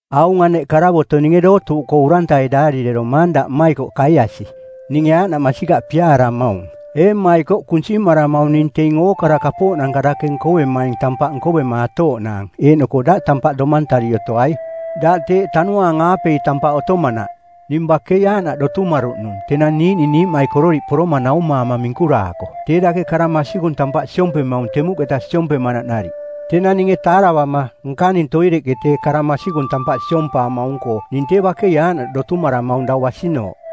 Aung aneꞌ karavoto˜ ninge dootuuꞌkoo urantai daarireromaang daꞌ mmaikoꞌ Kaiasi, ninge aaꞌnaꞌ masikaꞌ piaaramaung. Ee mmaikoꞌ, kunsimaramaung ning teing ookara kapooꞌnanka dake nkovemaing tampaꞌ nkovemaatooꞌnaang eeꞌnoko daꞌ tampaꞌ domantari otoai, daꞌ teeꞌ Tanuaang-aapei tampaꞌ otomanaꞌ. Ning bakei aaꞌnaꞌ dotumaruꞌnung tenang niiꞌning niiꞌmaikororiꞌ poroma naumaama minkuraako tee dake kara masikung tampaꞌ siompemaung temuꞌketa siompemanaꞌ nariꞌ. Tenang ninge taaravama, nkaning toireꞌke tee kara masikung tampaꞌ siompaamaung-koo ning tee bakei aaꞌnaꞌ dotumaramaung dau basinooꞌ.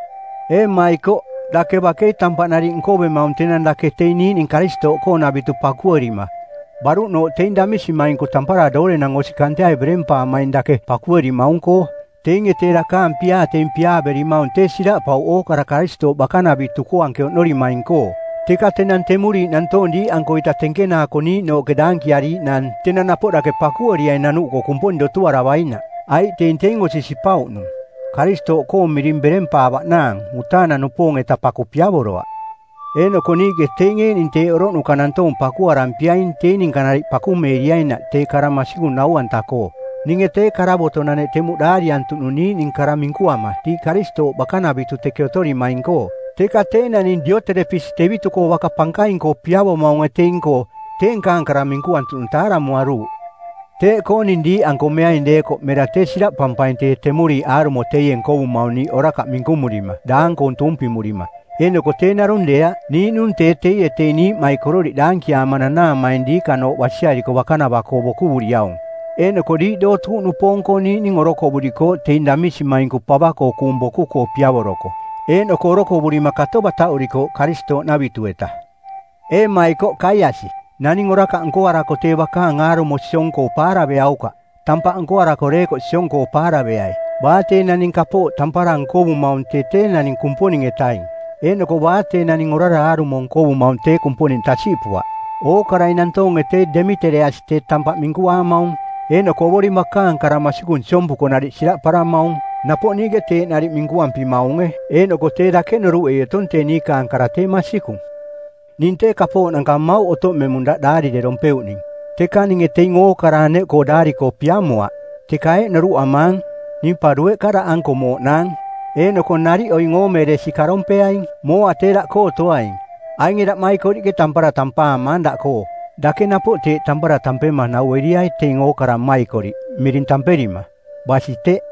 Ee mmaikoꞌ, dake bakei tampaꞌ nariꞌ nkovemaung tenang dake teing niiꞌning Karistooꞌkoonavitu pakuerima, baruꞌnooꞌ teing damisimainku tampara doorenang osi kanteai berempaamaing dake pakuerimaung-koo. Teinge tee dakaang piaa teing piaaverimaung tee siraꞌpauꞌ ookara Karistooꞌ bakanavitu-koo anke oꞌnorimaing-koo. Teka tenang temuriiꞌ nantoong diiꞌankoita tenkenaako niiꞌnooꞌke daankiariiꞌnaang, tenang napoꞌ dake pakueriai nanuꞌkoo Kumponing dotuaravainaꞌ. Aiꞌ teing teing osi sipauꞌnung Karistooꞌkoong miring berempaavaꞌnaang mutaanang-nupoong-eta paku piavoroaꞌ. Eeꞌnoko niiꞌke teing eeꞌning teeꞌ oroꞌnuka nantoong pakuarampiaing teing ninka nariꞌ pakumeeriainaꞌ tee kara masikung nau-anta-koo. Ninge tee karavotonaneꞌ temuꞌ daariantuꞌnung niiꞌning kara minkuama diiꞌ Karistooꞌ bakanavitu teke otorimaing-koo. Teka tee naning Dioterepisi tevitu-koo baka pankaing-koo piavomaunge teing-koo, tee nkaang kara minkuantuꞌnung taaramuaruuꞌ. Teeꞌkoo ning diiꞌanko meaing deekoꞌ mera tee siraꞌpampaing tee temuriiꞌ aarumo teie nkovumaung niiꞌ orakaꞌ minkumurima daang-koong tuumpimurima. Eeꞌnoko tee narung deeaꞌ, niiꞌnung tee teie teing niiꞌmaikororiꞌ daankiaama nanaamaing diikanooꞌ basiariko bakanava-koo bokuvuriaung, eeꞌnoko diiꞌ dootuuꞌnupoong-koo niiꞌning orokovurikooꞌ teing damisimainku pava-koo kuung boku-koo piavoroko, eeꞌnoko orokovurima kato bataꞌurikooꞌ Karistooꞌnavitu-eta. Ee mmaikoꞌ, Kaiasi, naning orakaꞌ nkoarako tee bakaang aarumo siong-koo paaraveaukaꞌ, tampaꞌ nkoarako deekoꞌ siong-koo paaraveai. Baa tee naning kapooꞌ tampara nkovumaung tee tee naning Kumponing-etaing eeꞌnoko baa tee naning orara aarumo nkovumaung tee Kumponing tasiꞌpuaꞌ. Ookarai nantoonge tee Demitereasi tee tampaꞌ minkuaamaung eeꞌnoko Ovoring bakaang kara masikung siompuko nariꞌ siraꞌparamaung. Napoꞌ niiꞌke teeꞌ nariꞌ minkuampimaunge eeꞌnoko tee dake noruꞌei otong tee niiꞌ niikaang kara tee masikung. Ning tee kapooꞌnanka mmauꞌ otoꞌmemung daꞌ daarirerompeuꞌning, teka ninge teing ookara aneꞌkoo daari-koo piamoaꞌ. Teka eeꞌ noruꞌamaang, ning pa dueꞌka daꞌanko mooꞌnaang, eeꞌnoko nariꞌ oing oomeeresi karompeaing. Mooa tee daꞌkoo otoaing. Ainge daꞌmaikoriꞌke tampara tampaamaang daꞌkoo. Dake napoꞌ teeꞌ tampara tampema naueriai teing ookara mmaikoriꞌ miring tamperima. Basi teꞌ.